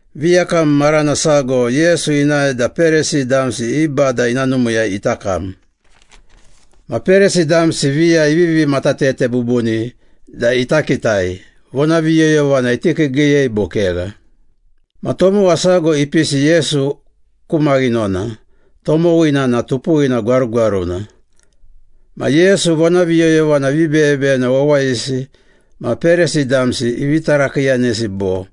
Viyakam marana sago Yesu inae da Perisi damsi i bada ina numiiyai ita kam. Ma Perisi damsi viya ivivi matatete bubuni da ita kitai, vonaviyoyovana iti kiigiiyei bo kegha. Ma tomowa sago ipisi Yesu ku maghinona, tomowina na tupuwina gwarugwaruna. Ma Yesu vonaviyoyovana vibeyebeyena wawayisi ma Perisi damsi ivi tarakiiyanesi bo,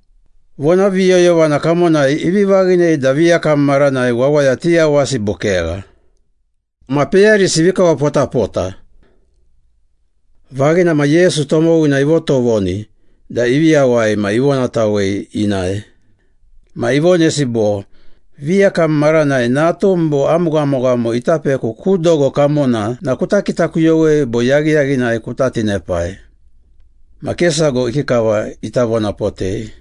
“Vonaviyoyovana kamonai ivi vaghinei da viyakam maranai wawaya tiyawasi bo kegha?” Ma peyarisi ivi kawapotapota. Vaghina ma Yesu tomowina ivotovoni da ivi yawai ma ivonatawei inae. Ma ivonesi bo, “Viyakam maranai natum bo am ghamoghamo ita peku ku dogo kamona na kuta kitakuyowei bo yaghiyaghinai kuta tinepai?” Ma ke sago ikikava ita vonapotei.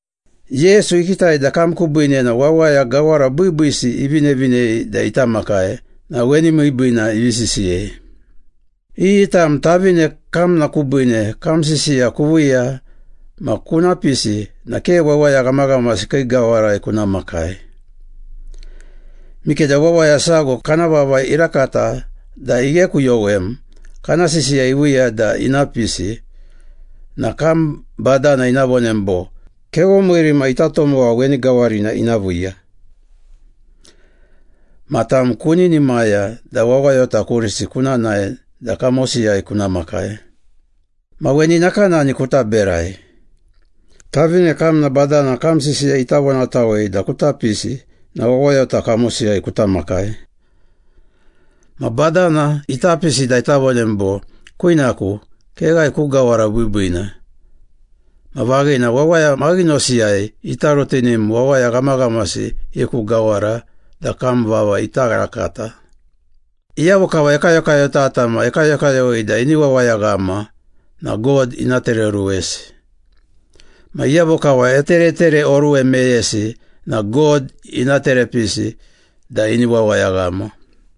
Yesu ikitai da kam kubiine na wawaya gawara biibiisi ivinevinei da ita makai na weni miibiina ivi isisiyei. “Iyi tam tavine kamna kubiine kam sisiya kuviiya ma kuna pisi na ke wawaya ghamaghamasi kii gawarai kuna makai. Mikeda wawaya sago kana vava irakata da ighekuyowem kana sisiya iviiya da ina pisi na kam badana ina vonem bo, ‘Kevomiiri ma ita tomowa weni gawarina ina viiya.’ Ma tam kuninimaya da wawayota kurisi kuna nae da kamosiyai kuna makai. Ma weni nakanani kuta berai. Tavine kamna badana kam sisiya ita vonatawei da kuta pisi na wawayota kamosiyai kuta makai. Ma badana ita pisi da ita vonem bo, ‘Kwinaku, keghae ku gawara biibiina.’ Ma vaghina, wawaya maghinosiyai ita rutinim wawaya ghamaghamasi i ku gawara da kam vava ita rakata. Iyavo kava ekayokayotata ma ekayokayowei da ini wawayaghama na God ina tereoruwesi. Ma iyavo kava eteretereoruwe meyesi na God ina terepisi da ini wawayaghama.”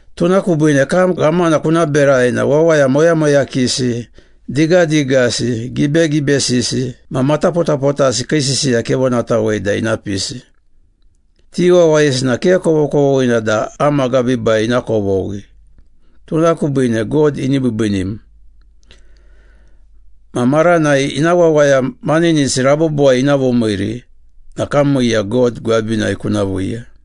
Tuna kubiine kam ghamana kuna berai na wawaya moyamoyakisi, digadigasi, gibegibesisi ma matapotapotasi kii sisiya kevonatawei da ina pisi. Ti wawayisi na ke kovokovoghina da am agabiibai ina kovoghi, tuna kubiine God ini biibiinim. Ma maranai ina wawaya maninisi rabobowai ina vomiiri na kam miiya God gwabinai kuna viiya.”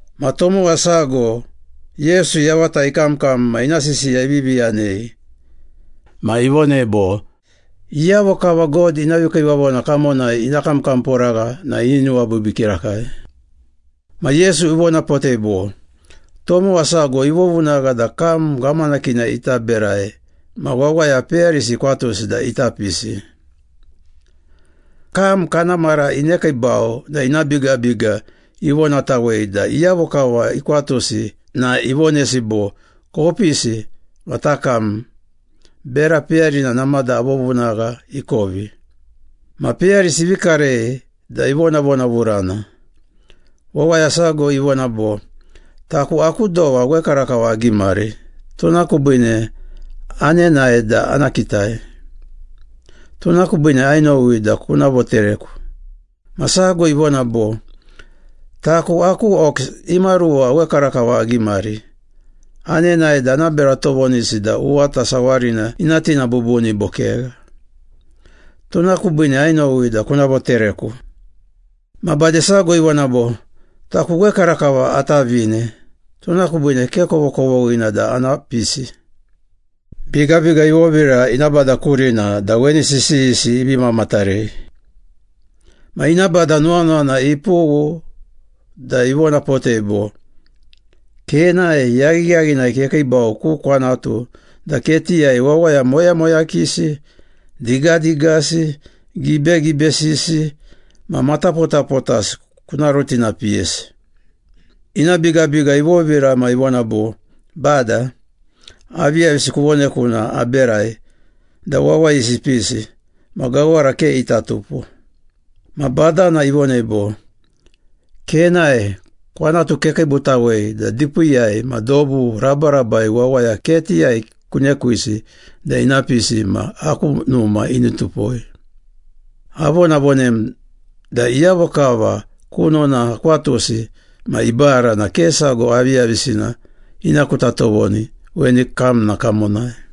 Ma tomowa sago Yesu yavata ikamkam ma ina sisiya ivivi yanei. Ma ivonei bo, “Iyavo kava God ina vikiivavona kamonai ina kamkamporagha na ini nuwabiibii kirakai.” Ma Yesu ivonapotei bo, “Tomowa sago ivovunagha da kam ghamanakina ita berai ma wawaya peyarisi ikwatusi da ita pisi. Kam kana mara inekiibau na ina bigabiga ivonatawei da iyavo kava ikwatusi na ivonesi bo, ‘Kopisi ma takam, bera peyarina namada avovunagha ikovi.’ Ma peyarisi ivi karei da ivonavonavurana. Wawaya sago ivona bo, ‘Taku aku dowa wekarakava agimari, tuna kubiine anenae da ana kitai. Tuna kubiine ainowi da kuna votereku.’ Ma sago ivona bo, ‘Taku aku ox imaruwa wekarakava agimari. Anenae da ana bera tovonisi da uwata sawarina ina tina bubuni bo kegha. Tuna kubiine ainowi da kuna votereku.’ Ma bade sago ivona bo, ‘Taku wekarakava atavine, tuna kubiine ke kovokovoghina da ana pisi.’ Bigabiga ivovira ina bada kurina da weni sisiyisi ivi mamatarei. Ma ina bada nuwanuwana ipughu da ivonapotei bo, ‘Kenae, yaghiyaghinai kekiibau ku kwanatu da ketiyai wawaya moyamoyakisi, digadigasi, gibegibesisi ma matapotapotasi kuna rutinapiyesi.’ Ina bigabiga ivovira ma ivona bo, ‘Bada, aviyavisina kuvoneku na aberai da wawayisi ipisi, ma gawara ke ita tupo.’ Ma badana ivonei bo, ‘Kenae, kwanatu kekiibutawei da dipiiyai ma dobu rabarabai wawaya ketiyai kunekwisi da ina pisi ma aku numa ini tupoi. Avonavonem da iyavo kava kunona akwatusi ma ibara na ke sago aviyavisina ina kuta tovoni weni kamna kamonai.’”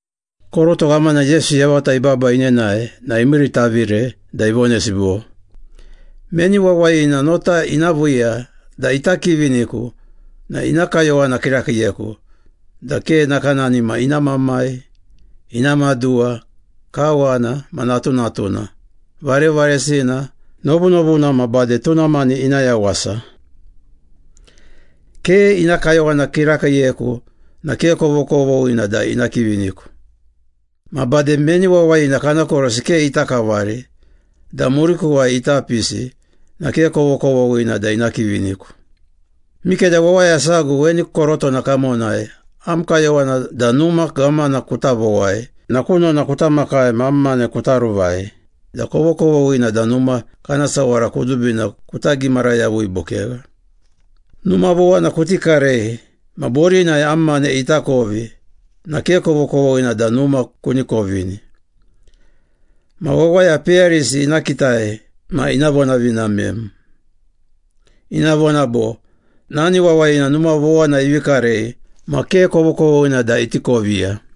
Koroto ghamana Yesu yavata ibaba inenae na imiiritavire da ivonesi bo, “Meni wawayina nota ina viiya da ita kiviniku na ina kayowana kirakiiyeku da ke nakanani ma ina mamai, ina maduwa, kawana ma natunatuna, varevaresina, novunovuna ma bade tuna mani ina yawasa. Ke ina kayowana kirakiiyeku na ke kovokovoghina da ina kiviniku. Ma bade meni wawayina kana korosi ke ita kavari da murikuwai ita pisi na ke kovokovoghina da ina kiviniku. Mikeda wawaya sago weni korotona kamonai am kayowana da numa ghamana kuta vowai na kunona kuta makai ma am mane kuta ruvai da kovokovoghina da numa kana sawara kudubina kuta gimara yavui bo kegha. Numa vowana kuti karei ma borinai am mane ita kovi na ke kovokovoghina da numa kuni kovini. Ma wawaya peyarisi ina kitai ma ina vonavinamem. Ina vona bo, ‘Nani wawayina numa vowana ivi karei ma ke kovokovoghina da iti koviya.’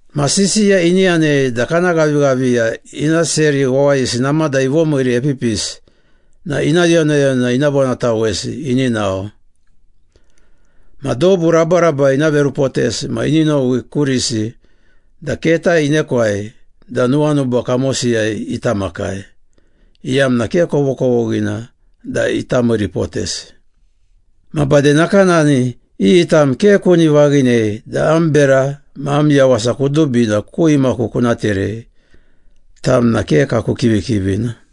Ma sisiya ini yanei da kana ghavighaviya ina seri wawayisi namada ivomiiri epipisi na ina yonayona ina vonatawesi ini nao. Ma dobu rabarabai ina verupotesi ma ini nowi kurisi da keta inekwai da nuwanuba kamosiyai ita makai, iyamna ke kovokovoghina da ita miiripotesi. Ma bade nakanani, iyi tam ke kuni vaghinei da am bera ma am yawasa kudubina ku imaku kuna terei, tam na ke kaku kivikivina.”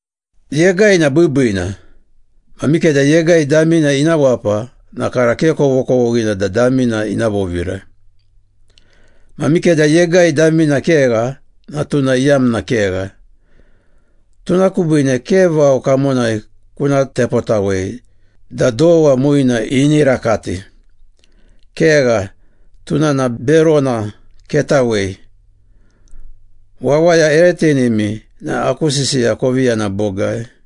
“Yegai na biibiina. Ma mikeda yegai damina ina wapa na kara ke kovokovoghina da damina ina vovira. Ma mikeda yegai damina kegha na tuna iyamna kegha. Tuna kubiine ke vao kamonai kuna tepotawei da dowa muina ini rakati. Kegha, tuna na berona, ketawei. Wawaya ere tinimi na aku sisiya kovi yana bogai.”